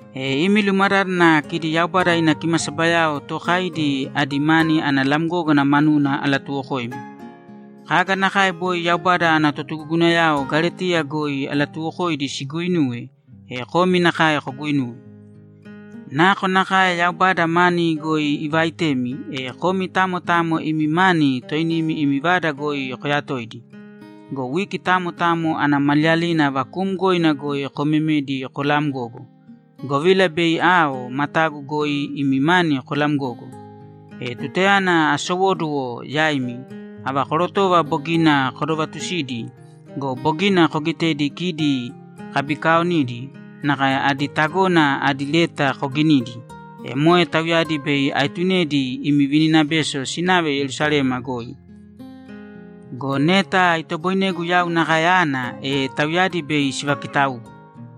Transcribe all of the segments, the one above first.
E imi lumadádana kidi Yaubada ina kimasabayao tookaidi adi mani ana lamgógana manuna alatuwokoimi. Kaga nakae boi Yaubada ana totugugunayao Galetiya goi alatuuwokoidi siguuinuwe, e komi nakae koguinūwe. Nakonakae Yaubada mani goi ivaaitemi, e komi tamo tamo imi mani toinimi imi vada goi koyatōidi. Go wiki tamo tamo ana maliyalina vakuumgoina goi komemēdi kolamgōgo, govila bei ao, matagu goi imi mani kolamgogo. E tutayana asowóduwo yaimi, ava korotova bogina kodovatusidi go, bogina kogitedi kidi kabikaaonidi nakae adi tagona adi leta koginidi, e moe tauyadi bei aetunedi imi vininabeso sinave Yerusalema goi. Go neta itoboinegu yau nakae ana, e tauyadi bei sivakitaugu.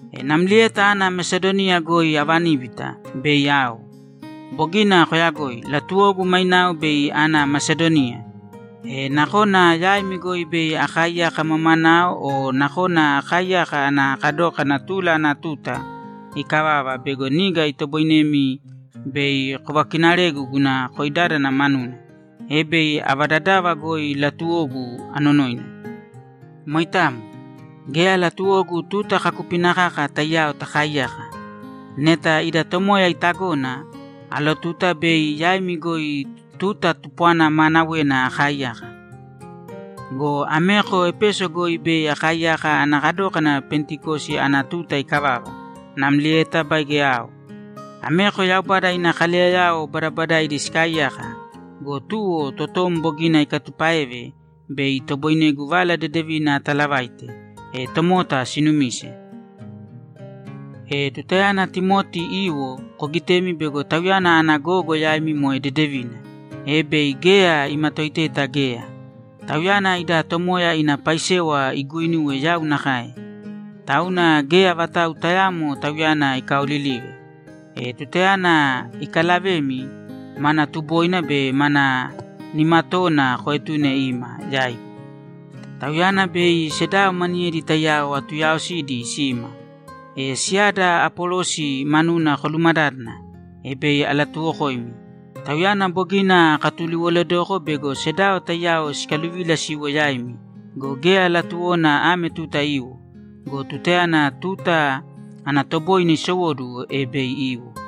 E namlieta ana Mesadoniya goi avaníbita, bei ao. Bogina koyagoi. Latuwogu mainao bei ana Mesadoniya. E nakona yaimi goi bei akaaiyaka mamanao o nakona akaaiyaka ana kadókana tula ana tuta ikavava bego niga itoboinemi bei kovakinaregu guna koidádana manuna, e bei ava dadava goi latuwogu, anonoina. Moitamo. Geya latuwogu tuta kaakupina kaka taiyao takaaiyaka. Neta ida Tomoya itagona, alotuta bei yaimi goi tuta tupwana maanawena akaaiyaka. Go ameko Epeso goi bei akaaiyaka ana kadókana Pentikosi ana tuta ikavava, namlieta baige ao. Ameko Yaubada ina kaleyayao badabadaidi sikaaiyaka go, tuwo totom bogina ikatupáeve bei itoboinegu Vala Dedevina atalavaite, e tomota sinumise. E tutayana Timoti iwo, kogitēmi bego tauyana ana gogo yaimi moe dedevina, e bei geya imatoiteta geya. Tauyana ida Tomoya ina paisewa iguuinuwe yau nakae. Tauna geya vatau tayaamo tauyana ikaolilīve. E tutayana ikalavemi, mana tuboina be ma nimatoona koetūne ima yaigu. Tauyana be sedao maniyedi taiyao atuyaaosidi sima. E siyada Apolosi manuna kolumadádana, e bei alatuwokoimi. Tauyana bogina akatuliwoledoko bego sedao taiyao sikaluvila siwo yaimi go, geya latuwona ame tuta iwo. Go tutayana tuta ana toboine isowóduwo, e bei iwo.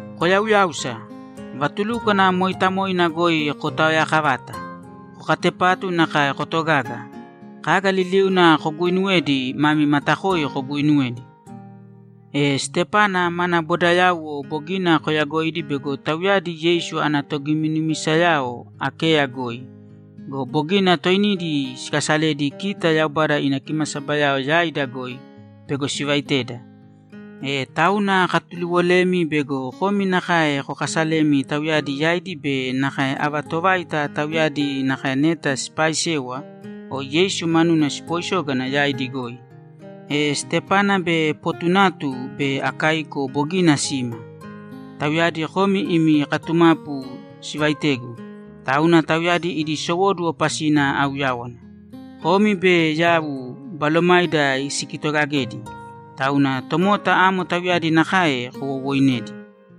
Koyauyāusa. Vatulúkwana mooitamoina goi kotaoyaakavāta. Kokatepātu nakae kotogāga. Kaga liliuna koguuinuwedi, mami matakoi koguuinuwēdi. E Stepana mana bodayauwo bogina koyagoidi bego tauyadi Yeisu ana togiminumisayao Akeya goi go, bogina toinidi sikasaledi kita Yaubada ina kimasabayao yaida goi bego sivaiteda. E tauna akatuliwolemi bego komi nakae kokasalēmi tauyadi yaidi be nakae ava tovaita tauyadi nakae neta sipaaisewa o Yeisu manuna sipooisógana yaidi goi. E Stepana be Potunatu be Akaiko bogina sima. Tauyadi komi imi katumapu sivaitegu, tauna tauyadi idi sowóduwo pasina auyáwana. Komi be yau balomaida sikitogagedi. Tauna tomota amo tauyadi nakae kowowoinēdi.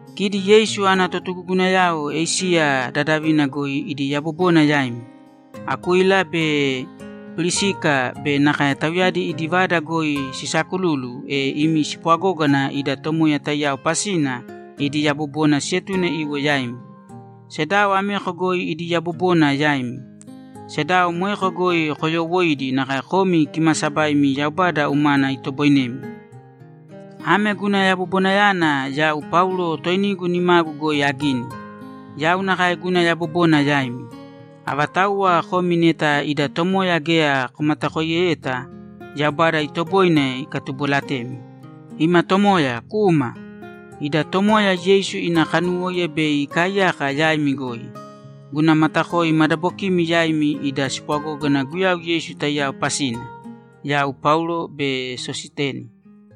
Kidi Yeisu ana totugugunayao Esiya dadavina goi idi yabobona yaimi. Akuila be Pirisika be nakae tauyadi idi vada goi sisaakululu, e imi spwagógana ida Tomoya taiyao pasina idi yabobona sietune iwo yaimi. Sedao ameko goi idi yabobona yaimi. Sedao moeko goi koyoowoiīdi nakae komi kimaasabaimi Yaubada umana itoboinemi. Ame guna yabobonayana yau Paulo toinigu nimagu goi agini. Yau nakae guna yabobona yaimi. Avatauwa komi neta ida Tomoya geya komatakoiyeta, Yaubada itoboine ikatubolatemi. Ima Tomoya, kūma! Ida Tomoya Yeisu ina kanuwóiya bei ikaaiyaka yaimi goi. Guna matakoi madabokimi yaimi ida spwagógana Guyau Yeisu taiyao pasina. Yau Paulo be Sositeni